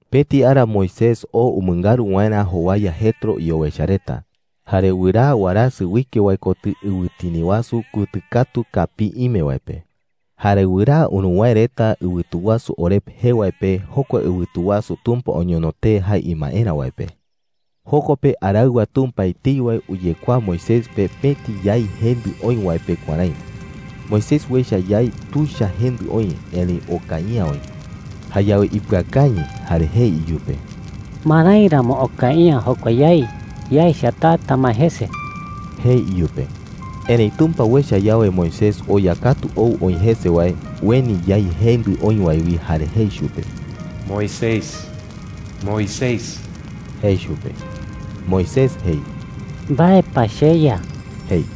Pëti ara Moisés oo umɨngaru waerä jowaya Jetro iowecha reta. Jare wɨraa warasɨ uike wae kotɨ ɨwɨtini wasu kutɨ katu kapii ime wae pe. Jare wɨraa uruwäe reta ɨwɨtu wasu Horeb Jokua ɨwɨtu wasu jee wi ko Sinaí. jee wae pe, jokua ɨwɨtu wasu Tumpa oñono tee jae imaerä wae pe. Joko pe araɨwa Tumpa etei wae uyekuaa Moisés pe pëti yái jendɨ oï wae pe kuärái: Moisés uecha yái tuicha jendɨ oï, erëi okai’ä oï. Jayawe ipɨakañɨ jare jei iyupe: “¿Marái ramo okai’ä jokua yái? Yaecha, taa tamae jese,” jei iyupe. Erëi Tumpa uecha yawe Moisés oya katu ou oï jese wae, ueni yái jendɨ oï wae wi jare jei chupe: “¡Moisés, Moisés!” jei chupe. Moisés jei: “¿Mbae pa, cheYa?” jei.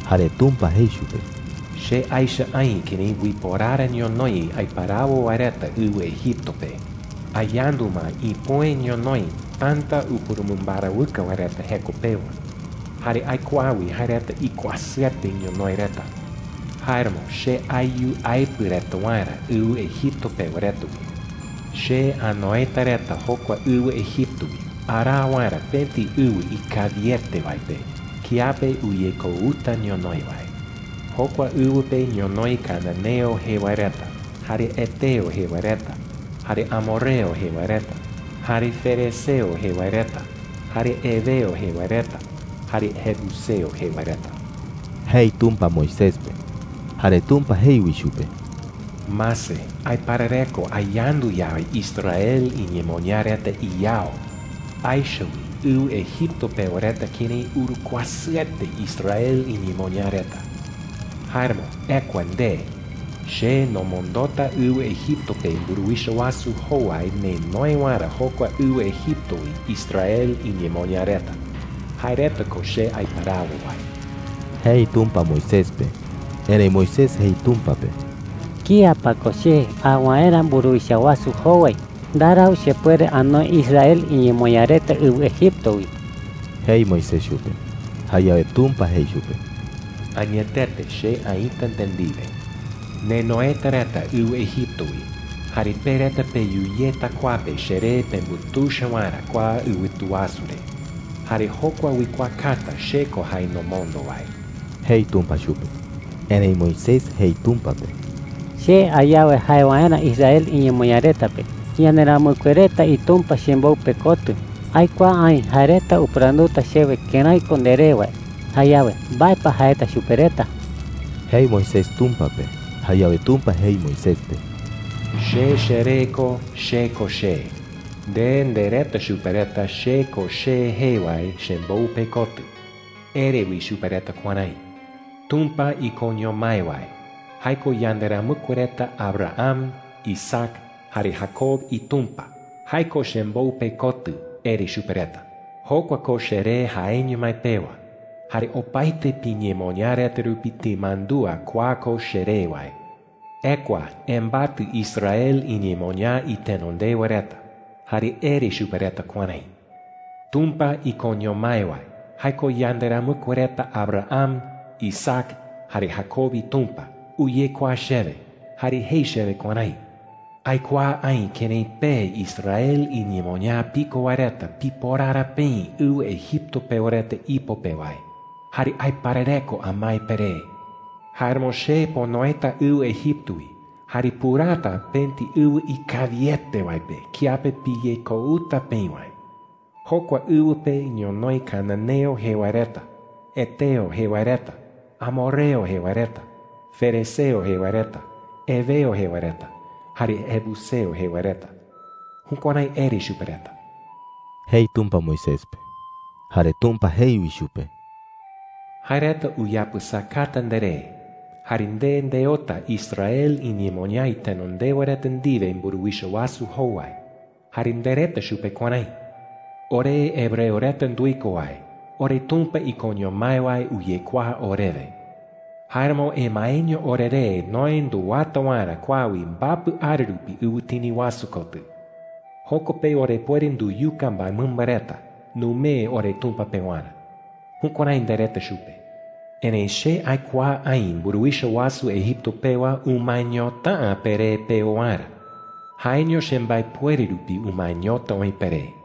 Jare Tumpa jei chupe: “Che aecha aï kërái uiporara ñonoï aiparawo wae reta ɨwɨ Egipto pe,” jei. “Ayandu ma ipüe ñonoï täta upurumɨmbarawɨkɨ wae reta jeko pewa. Jare aikuaa wi jae reta ikuasɨete ñonoï reta,” jei. “Jáeramo che ayu aepɨ reta waerä ɨwɨ Egipto pewa reta wi,” jei. “Che anoeta reta jokua ɨwɨ Egipto wi araa waerä pëti ɨwɨ ikawiete wae pe kiape uyekouta ñonoï wae,” jei. “Jokua ɨwɨ pe ñonoï cananeo jee wae reta, jare heteo jee wae reta, jare amorreo jee wae reta, jare ferezeo jee wae reta, jare heveo jee wae reta, jare jebuseo jee wae reta,” jei Tumpa Moisés pe. Jare Tumpa jei wi chupe: “Mase, aiparareko ayandu yawe Israel iñemoñaa reta iyao,” jei. “Aecha wi ɨwɨ Egipto pewa reta kërái urukuasɨete Israel iñemoñaa reta,” jei. “Jáeramo ekua nde. Che nomondota ɨwɨ Egipto pe mburuwicha wasu jowai nenoe waerä jokua ɨwɨ Egipto wi Israel iñemoñaa reta – jae reta ko che aiparawo wae,” jei Tumpa Moisés pe. Erëi Moisés jei Tumpa pe: “¿Kía pa ko che a waerä mburuwicha wasu jowai? Ndarau chepuere anoe Israel iñemoñaa reta ɨwɨ Egipto wi,” jei Moisés chupe. Jayawe Tumpa jei chupe: “Añetete che aïta nde ndiwe,” jei. “Nenoeta reta ɨwɨ Egipto wi. Jare pe reta peyu yeta kua pe cheree pembutuicha waerä kua ɨwɨtu wasu re. Jare jokua uikuaakata che ko jae nomondo wae,” jei Tumpa chupe. Erëi Moisés jei Tumpa pe: “Che a yawe jae waerä Israel iñemoñaa reta pe, ‘Yanderamɨkue reta iTumpa chembou pekotɨ,’ aikuaa aï jae reta upɨranduta chewe kërái ko nderee wae. Jayawe, ¿mbae pa jaeta chupe reta?” jei Moisés Tumpa pe. Jayawe Tumpa jei Moisés pe: “Che cheree ko CHE KO CHE,” jei chupe. “Nde ndereta chupe reta, ‘CHE KO CHE jee wae chembou pekotɨ.’ Ere wi chupe reta kuärái: ‘Tumpa ikoño mái wae – jae ko yanderamɨkue reta Abraham, Isaac, jare Jacob iTumpa – jae ko chembou pekotɨ,’ ere chupe reta. Jokua ko cheree jaeño mái pewa, jare opaete piñemoñaa reta rupi timandúa kua ko cheree wae,” jei. “Ekua embatɨ Israel iñemoñaa itenondewa reta, jare ere chupe reta kuärái: ‘Tumpa ikoño mái wae – jae ko yanderamɨkue reta Abraham, Isaac, jare Jacob iTumpa – uyekuaa chewe jare jei chewe kuärái: ‘Aikuaa aï kërái pe Israel iñemoñaa piko wae reta piporara peï ɨwɨ Egipto pewa reta ipo pe wae. Jare aiparareko amae peré. Jáeramo che ponoeta ɨwɨ Egipto wi jare puraata pëti ɨwɨ ikawiete wae pe kiape piyekouta peï wae. Jokua ɨwɨ pe ñonoï cananeo jee wae reta, heteo jee wae reta, amorreo jee wae reta, ferezeo jee wae reta, heveo jee wae reta, jare jebuseo jee wae reta.’ Jukuärái ere chupe reta,” jei Tumpa Moisés pe. Jare Tumpa jei wi chupe: “Jae reta uyapɨsakata nderé. Jare nde ndeota Israel iñemoñaa itenondewa reta ndiwe mburuwicha wasu jowai, jare ndereta chupe kuärái: ‘Ore hebreo reta nduiko wae, oreTumpa ikoño mái wae uyekuaa orewe. Jáeramo emaeño oreré noë nduwata waerä kua wi mbapɨ ara rupi ɨwɨtini wasu kotɨ. Joko pe orepuere nduyuka mbaemɨmba reta numee oreTumpa pewarä.’ Jukuärái ndereta chupe,” jei. “Erëi che aikuaa aï mburuwicha wasu Egipto pewa umaeñota’ä peré peo waerä. Jaeño chembaepuere rupi umaeñota oï peré,” jei.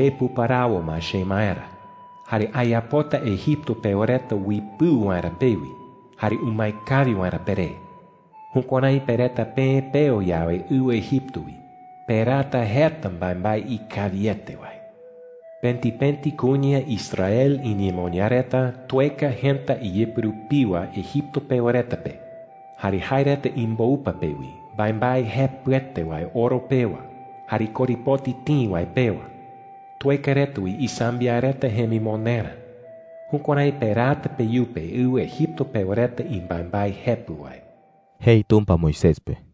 “Che puparawo ma chemaerä. Jare ayapota Egipto pewa reta uipɨu waerä pewi jare umae kawi waerä peré. Jukuärái pe reta peë peo yawe ɨwɨ Egipto wi, peraata jeta mbaembae ikawiete wae,” jei. “Pëti pëti kuña Israel iñemoñaa reta tueka jëta iyɨpɨ rupiwa Egipto pewa reta pe, jare jae reta imboupa pe wi, mbaembae jepɨete wae oro pewa jare korepoti tïi wae pewa. Tueka reta wi isambiaɨ reta jemimonderä. Jukuärái peraata peyupe ɨwɨ Egipto pewa reta imbaembae jepɨ wae,” jei Tumpa Moisés pe.